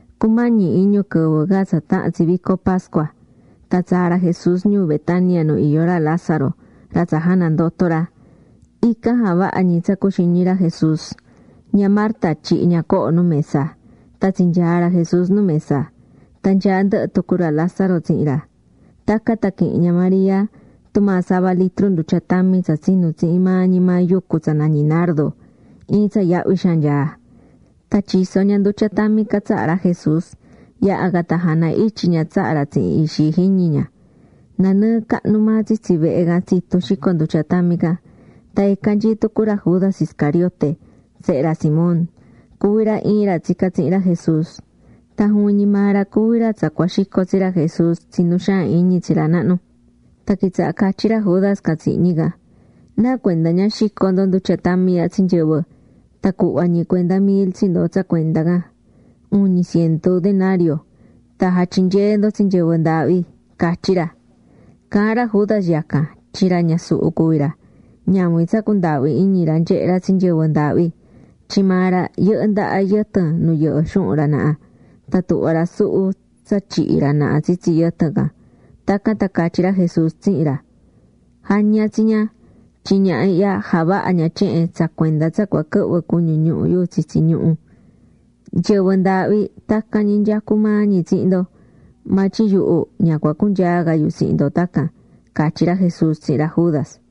Cumañi iñu quɨvɨ ca tsa tahan tsi vico pascua, tan tsaa̱ ra Jesús ñuu Betania nu iyó ra Lázaro, ra tsa janandoto̱ ra. Ican javaha̱ ñi tsa cuxiñi̱ ra Jesús. Ña Marta tyihi̱ ña coho nu mesa. Tan tsinyaa̱ ra Jesús nu mesa. Tan nyaá ndɨhɨ tucu ra Lázaro tsihin ra. Tacan tan quihi̱n ña María tumaa sava litru ndutya tami tsa tsinu̱ tsihin maa ñi maa yucu tsa nañí nardo, iin tsa yahvi xaan nyaá. Tan tyiso̱ ña ndutya tami can tsaha ra Jesús. Yaha̱ can tan jana ityi ña tsaha ra tsihin ixi jiñi ña. Nanɨɨ cahnu maa tsitsi vehe can tsitu̱ xico ndutya tami can. Tan ican nyií tucu ra Judas Iscariote, sehe ra Simón. Cuví ra iin ra tsicá tsihin ra Jesús. Tan juvin ñi maa ra cuví ra tsa cua xico tsi ra Jesús tsi nu xaan iñi tsi ra nahnu. Tan quitsaha̱ catyí ra Judas can tsihin ñi can: ―¿Nacuenda ña xico̱ ndo ndutya tami ihya tsi nyɨvɨ, tan cuhva ñi cuenda mil tsi ndo tsa cuenda can, (uñi cientu denario) tan jatyinyee ndo tsi nyɨvɨ ndaahvi? ―catyí ra. Caahán ra Judas yacan tyin ra ñasuhu cuví ra, ñavin tsa cundaahví iñi ra nyehé ra tsi nyɨvɨ ndaahvi. Tyin maa ra yɨhɨ́ ndaha yɨtɨn nu yɨhɨ́ xuhun ra naha, tan tuhvá ra suhu tsa tyihí ra naha tsitsi yɨtɨn can. Tacan tan catyí ra Jesús tsihin ra: ―Ja̱ña tsi ña, tyin ñaha ihya javaha̱ ña tyehen tsa cuenda tsa cua quɨhvɨ cuñu ñuhu yu tsitsi ñuhu. Nyɨvɨ ndaahvi tacan ñi nyecú maa ñi tsihin ndo, maa tyin yuhu ña cua cunyaa ca yu tsihin ndo tacan ―catyí ra Jesús tsihin ra Judas.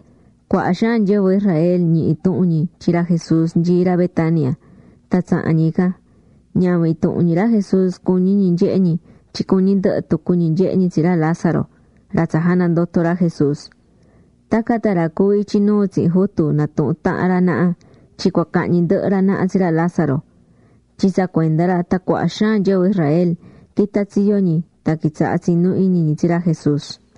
Cuaha xaan nyɨvɨ Israel ñihi̱ tuhun ñi tyin ra Jesús nyií ra Betania, tan tsaha̱n ñi ican. Ñavin intuhun ñi ra Jesús cuñí ñi nyehe ñi tyin cuñí ndɨhɨ tucu ñi nyehe ñi tsi ra Lázaro, ra tsa janandoto̱ ra Jesús. Tacan tan ra cuví ityi nuu tsihin jutu natuhu̱n tahan ra naha tyin cua cahñi ndɨhɨ ra naha tsi ra Lázaro. Tyin tsa cuenda ra tan cuaha xaan nyɨvɨ Israel quitá tsiyo ñi tan quitsaha̱ tsinú iñi ñi tsi ra Jesús.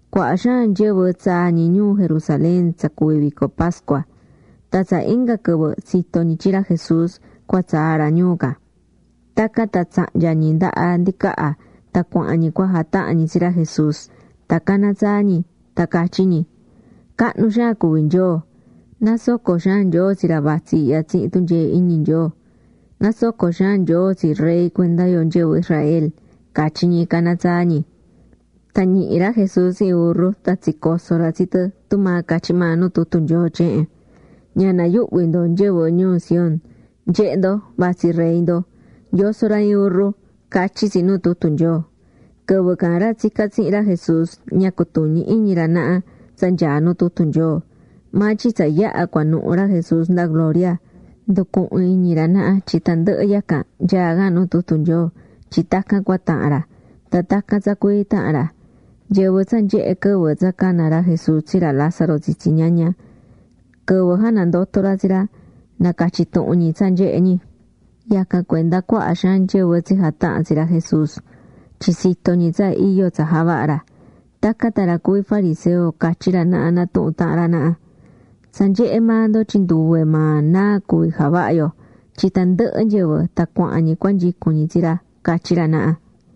Cuaha xaan nyɨvɨ tsaa̱ ñi ñuu Jerusalén tsa cuví vico pascua. Tan tsa inga quɨvɨ tsito̱ ñi tyin ra Jesús cua tsaa ra ñuu can. Tacan tan tsahnya̱ ñi ndaha ndicaha tan cuahán ñi cua jatahan ñi tsi ra Jesús. Tan caná tsaa ñi, tan catyí ñi: ―¡Cahnu xaan cuví Nyoo! ¡Nasoco xaan Nyoo tsi ra vatsí ihya tsihin tunyee iñi Nyoo! ¡Nasoco xaan Nyoo tsi Rey cuenda yo nyɨvɨ Israel! ―catyí ñi, caná tsaa ñi. Tan ñihi̱ ra Jesús iin burru tan tsicoso̱ ra tsi tɨ tumaa catyí maa nu tutu Nyoo tyehen: Ña na̱yuhvi ndo nyɨvɨ ñuu Sión Nye̱he ndo, vatsí Rey ndo. Yosó ra iin burru ―catyí tsi nu tutu Nyoo. Quɨvɨ can ra tsicá tsihin ra Jesús, ña cutuñí iñi ra naha tsa nyaá nu tutu Nyoo. Maa tyin tsa yaha̱ cuanuhu ra Jesús nda gloria, nducuhu̱n iñi ra naha tyin tandɨhɨ yacan nyaá can nu tutu Nyoo tyin tacan cua tahan ra. Tan tacan tsa cuii taha̱n ra. Nyɨvɨ tsa nyehe̱ quɨvɨ tsa cana̱ ra Jesús tsi ra Lázaro tsitsi ñaña, quɨvɨ janandoto̱ ra tsi ra, nacatyí tuhun ñi tsa nyehe̱ ñi. Yacan cuenda cuaha xaan nyɨvɨ tsijataha̱n tsi ra Jesús, tyin tsito̱ ñi tsa iyo tsa javaha̱ ra. Tacan tan ra cuví fariseo catyí ra naha natuhun tahan ra naha: ―Tsa nyehé maa ndo tyin nduve maa náa cuví javahá yo, tyin tandɨhɨ nyɨvɨ tan cuahán ñi cuanyicún ñi tsi ra ―catyí ra naha.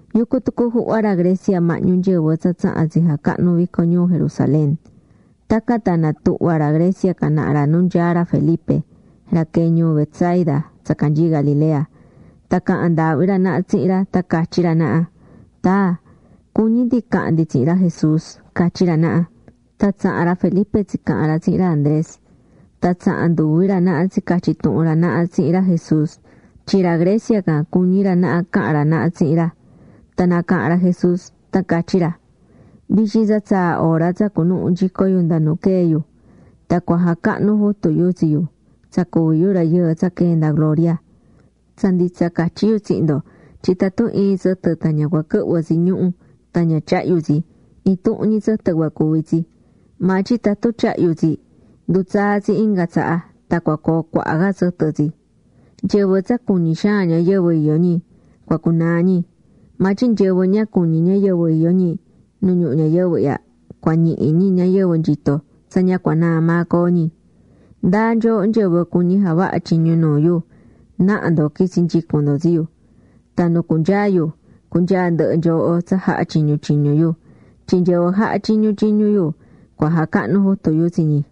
Yucú tucu juhva ra Grecia mahñu nyɨvɨ tsa tsaha̱n tsijacahnu̱ vico ñuu Jerusalén. Tacan tan natuhva̱ ra Grecia can naha ra nu nyaá ra Felipe, ra quee̱ ñuu Betsaida tsa canyií Galilea, tan caha̱n ndaahvi ra naha tsihin ra tan catyí ra naha: ―Taa, cuñí ndi cahan ndi tsihin ra Jesús ―catyí ra naha. Tan tsaha̱n ra Felipe tsicaha̱n ra tsihin ra Andrés. Tan tsaha̱n nduvi ra naha tsicatyi̱ tuhun ra naha tsihin ra Jesús tyin ra Grecia can cuñí ra naha cahan ra naha tsihin ra. Tan nacaha̱n ra Jesús, tan catyí ra: ―Vityin tsa tsaa̱ hora tsa cunuhu nyico yu nda nu quee̱ yu, tan cua jacahnu jutu yu tsi yu, tsa cuví yu Rayɨɨ tsa quee̱ nda gloria. Tsa nditsa catyí yu tsihin ndo tyin tatun iin tsɨtɨ tan ña cua quɨhvɨ tsi ñuhu̱ tan ña tyahyu tsi, intuhun ñi tsɨtɨ cua cuvi tsi. Maa tyin tatun tyahyu tsi, ndutsaa tsi inga tsaha tan cua coo cuaha ca tsɨtɨ tsi. Nyɨvɨ tsa cuñí xaan ñayɨvɨ iyó ñi, cua cunaa ñi. Maa tyin nyɨvɨ ña cuñí ñayɨvɨ iyó ñi nu ñuhu ñayɨvɨ ihya, cua ñihi ñi ñayɨvɨ nyitó tsa ña cua naa maa coo ñi. Ndáa nyooho nyɨvɨ cuñí javaha tyiñu nuu yu, naha ndo qu̱itsi nyicun ndo tsi yu. Tan nu cunyaa yu, cunyaa ndɨhɨ nyooho tsa jahá tyiñu tyiñu yu. Tyin nyɨvɨ jahá tyiñu tyiñu yu, cua jacahnu jutu yu tsi ñi.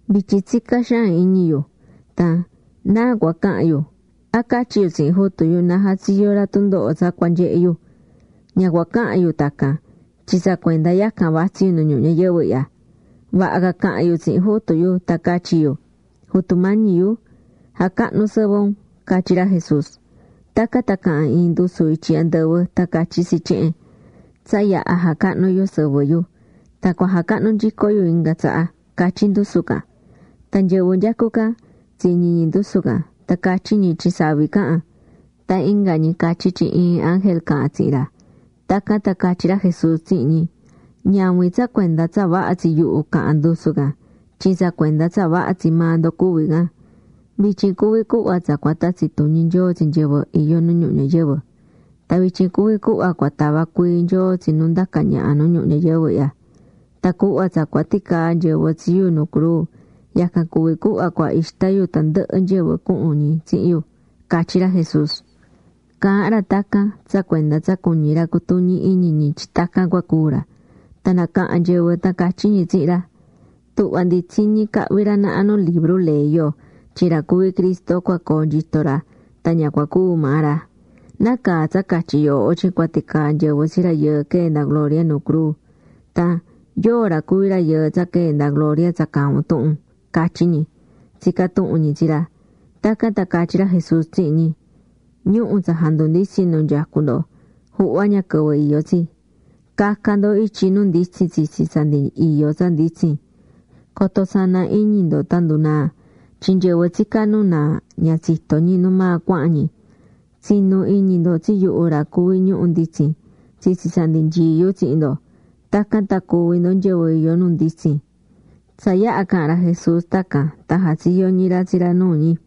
’Vityin tsicá xaan iñi yu. Tan ¿náa cua cahan yu? ¿A catyí yu tsihin Jutu yu na jatsiyo ra tundoho tsa nyaá cua nyehe yu? Ña cua cahan yu tacan tyin tsa cuenda yacan vatsí yu nu ñuhu ñayɨvɨ ihya. Vaha ca cahan yu tsihin Jutu yu tan catyi yu: “Jutu Mañi yu, ja̱cahnu sɨvɨ un” ―catyí ra Jesús. Tacan tan caha̱n iin ndusu ityi andɨvɨ tan catyí tsi tyehen: ―Tsa yaha̱ jacahnu̱ yu sɨvɨ yu, tan cua jacahnu nyico yu inga tsaha ―catyí ndusu can. Tan nyɨvɨ nyecú ican, tsiñi̱ ñi ndusu can, tan catyí ñi tyin savi caha̱n. Tan inga ñi catyí tyin iin ángel caha̱n tsihin ra. Tacan tan catyí ra Jesús tsihin ñi: ―Ñavin tsa cuenda tsa vaha tsi yuhu caha̱n ndusu can, tyin tsa cuenda tsa vaha tsi maa ndo cuví can. Vityin cuví cuhva tsa cua tatsi tuñi Nyoo tsi nyɨvɨ iyó nu ñuhu ñayɨvɨ. Tan vityin cuví cuhva cua tava cuii Nyoo tsi nu ndacá ñaha nu ñuhu ñayɨvɨ ihya. Tan cuhva tsa cua ticaa nyɨvɨ tsi yu nu cruu, yacan cuví cuhva cua ixta yu tandɨhɨ nyɨvɨ cuhun ñi tsihin yu ―catyí ra Jesús. Caahán ra tacan tsa cuenda tsa cuñí ra cutuñi iñi ñi tyin tacan cua cúu ra. Tan nacaha̱n nyɨvɨ tan catyí ñi tsihin ra: ―Tuhvá ndi tsiñí cahví ra naha nu libru ley yo tyin ra cuví Cristo cua coo nyitó ra tan ña cua cúu maa ra. ¿Nacaa tsa catyí yooho tyin cua ticaa nyɨvɨ tsi Rayɨɨ quee̱ nda gloria nu cruu? Tan ¿yóo ra cuví Rayɨɨ tsa quee̱ nda gloria tsa caahán un tuhun? ―catyí ñi, tsicá tuhun ñi tsi ra. Tacan tan catyí ra Jesús tsihin ñi: ―Ñuhu̱ tsa jandunditsín nu nyecú ndo, juhva ña quɨvɨ iyó tsi. Ca̱ca ndo ityi nu nditsin tsitsi tsa ndi iyó tsa nditsin. Coto sana iñi ndo tan ndunaa. Tyin nyɨvɨ tsicá nu naa ña tsitó ñi nu maa cuahán ñi. Tsi̱nu iñi ndo tsi yuhu ra cuví ñuhu̱ nditsin, tsitsi tsa ndi nyií yu tsihin ndo. Tacan tan cuví ndo nyɨvɨ iyó nu nditsin. Tsa yaha̱ caha̱n ra Jesús tacan tan jatsiyo̱ ñi ra tsi ra nuu ñi.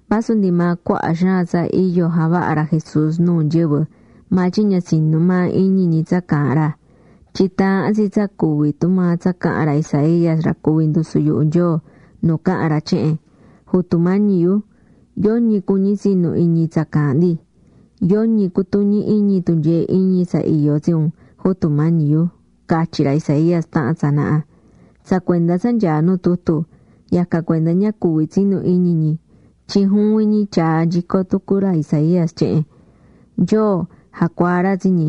Vasu ndi maa cuaha xaan tsa iyo javahá ra Jesús nuu nyɨvɨ maa tyin ña tsinú maa iñi ñi tsa caahán ra. Tyin taahán tsi tsa cuvi tumaa tsa caha̱n ra Isaías ra cuvi̱ ndusu yuhu Nyoo, nu caha̱n ra tyehen: Jutu Mañi yu, yoñi cuñí tsinu iñi tsa caahán ndi. Yoñi cutuñí iñi tunyee iñi tsa iyó tsi un, Jutu Mañi yu, catyi̱ ra Isaías taha̱n tsanaha. Tsa cuenda tsa nyaá nu tutu, yacan cuenda ña cuví tsinu iñi ñi tyin juvin ñi tyaa̱ nyico tucu ra Isaías tyehen: Nyoo jacuaa̱ ra tsi ñi.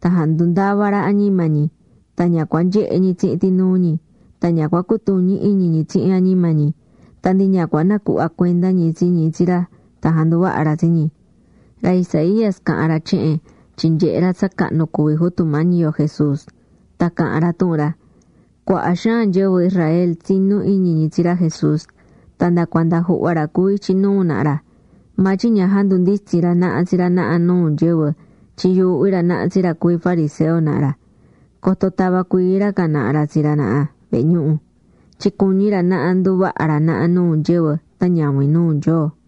Tan jandundava̱ ra añima ñi, tan ña cua nyehe ñi tsihin tinuu ñi, tan ña cua cutuñi iñi ñi tsihin añima ñi, tan ndi ña cua nacuhva cuenda ñi tsi ñi tsi ra tan janduvaha ra tsi ñi. Ra Isaías caha̱n ra tyehen tyin nyehe̱ ra tsa cahnu cuví Jutu Mañi yo Jesús, tan caha̱n ra tuhun ra. Cuaha xaan nyɨvɨ Israel tsinú iñi tsi ra Jesús. Tan nda cuanda juhva ra cuví ityi nuu naha ra. Maa tyin ña jandunditsi̱n ra naha tsi ra naha nuu nyɨvɨ tyin yuuhví ra naha tsi ra cuví fariseo naha ra. Coto tava cuii ra can naha ra tsi ra naha vehe ñuhu. Tyin cuñí ra naha nduvaha ra naha nuu nyɨvɨ tan ñavin nuu Nyoo.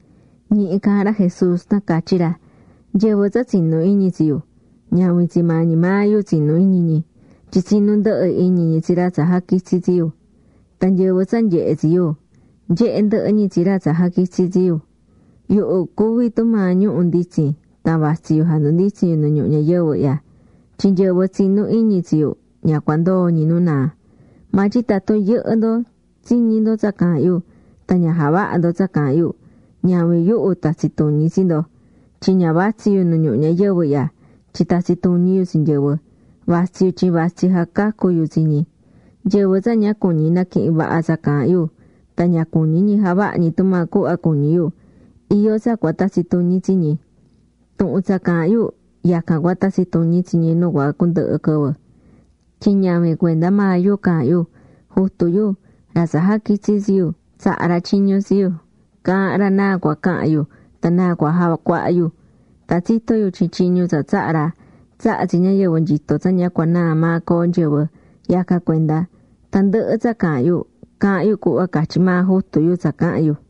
Ñihi caahán ra Jesús, tan catyí ra: ―Nyɨvɨ tsa tsinú iñi tsi yu, ñavin tsi maa ñi maa yu tsinú iñi ñi, tyin tsinú ndɨhɨ iñi ñi tsi ra tsa jaquitsi̱ tsi yu. Tan nyɨvɨ tsa nyehé tsi yu, nyehé ndɨhɨ ñi tsi ra tsa jaquitsi̱ tsi yu. Yuhu cuví tumaa ñuhu̱ nditsin tan vatsí yu jandunditsín yu nu ñuhu ñayɨvɨ ihya, tyin nyɨvɨ tsinú iñi tsi yu ña cua ndoo ñi nu naa. Maa tyin tatun yɨhɨ́ ndo tsiñí ndo tsa caahán yu, tan ña javahá ndo tsa caahán yu, ñavin yuhu tatsi tuñi tsi ndo. Tyin ña vatsí yu nu ñuhu ñayɨvɨ ihya tyin tatsi tuñi yu tsi nyɨvɨ. Vatsí yu tyin vatsí jacacú yu tsi ñi. Nyɨvɨ tsa ña cuñí naquihin vaha tsa caahán yu tan ña cuñí ñi javaha ñi tumaa cuhva cuñí yu, iyó tsa cua tatsi tuñi tsi ñi. Tuhun tsa caahán yu, yacan cua tatsi tuñi tsi ñi nu cua cundɨhɨ quɨvɨ. Tyin ñavin cuenda maa yu caahán yu. Jutu yu, ra tsa jaquitsi̱ tsi yu, tsaha̱ ra tyiñu tsi yu caahán ra náa cua cahan yu tan náa cua jacuaha yu. Tan tsitó yu tyin tyiñu tsa tsaha̱ ra, tsahá tsi ñayɨvɨ nyitó tsa ña cua naa maa coo nyɨvɨ. Yacan cuenda, tandɨhɨ tsa caahán yu, caahán yu cuhva catyí maa Jutu yu tsa cahan yu.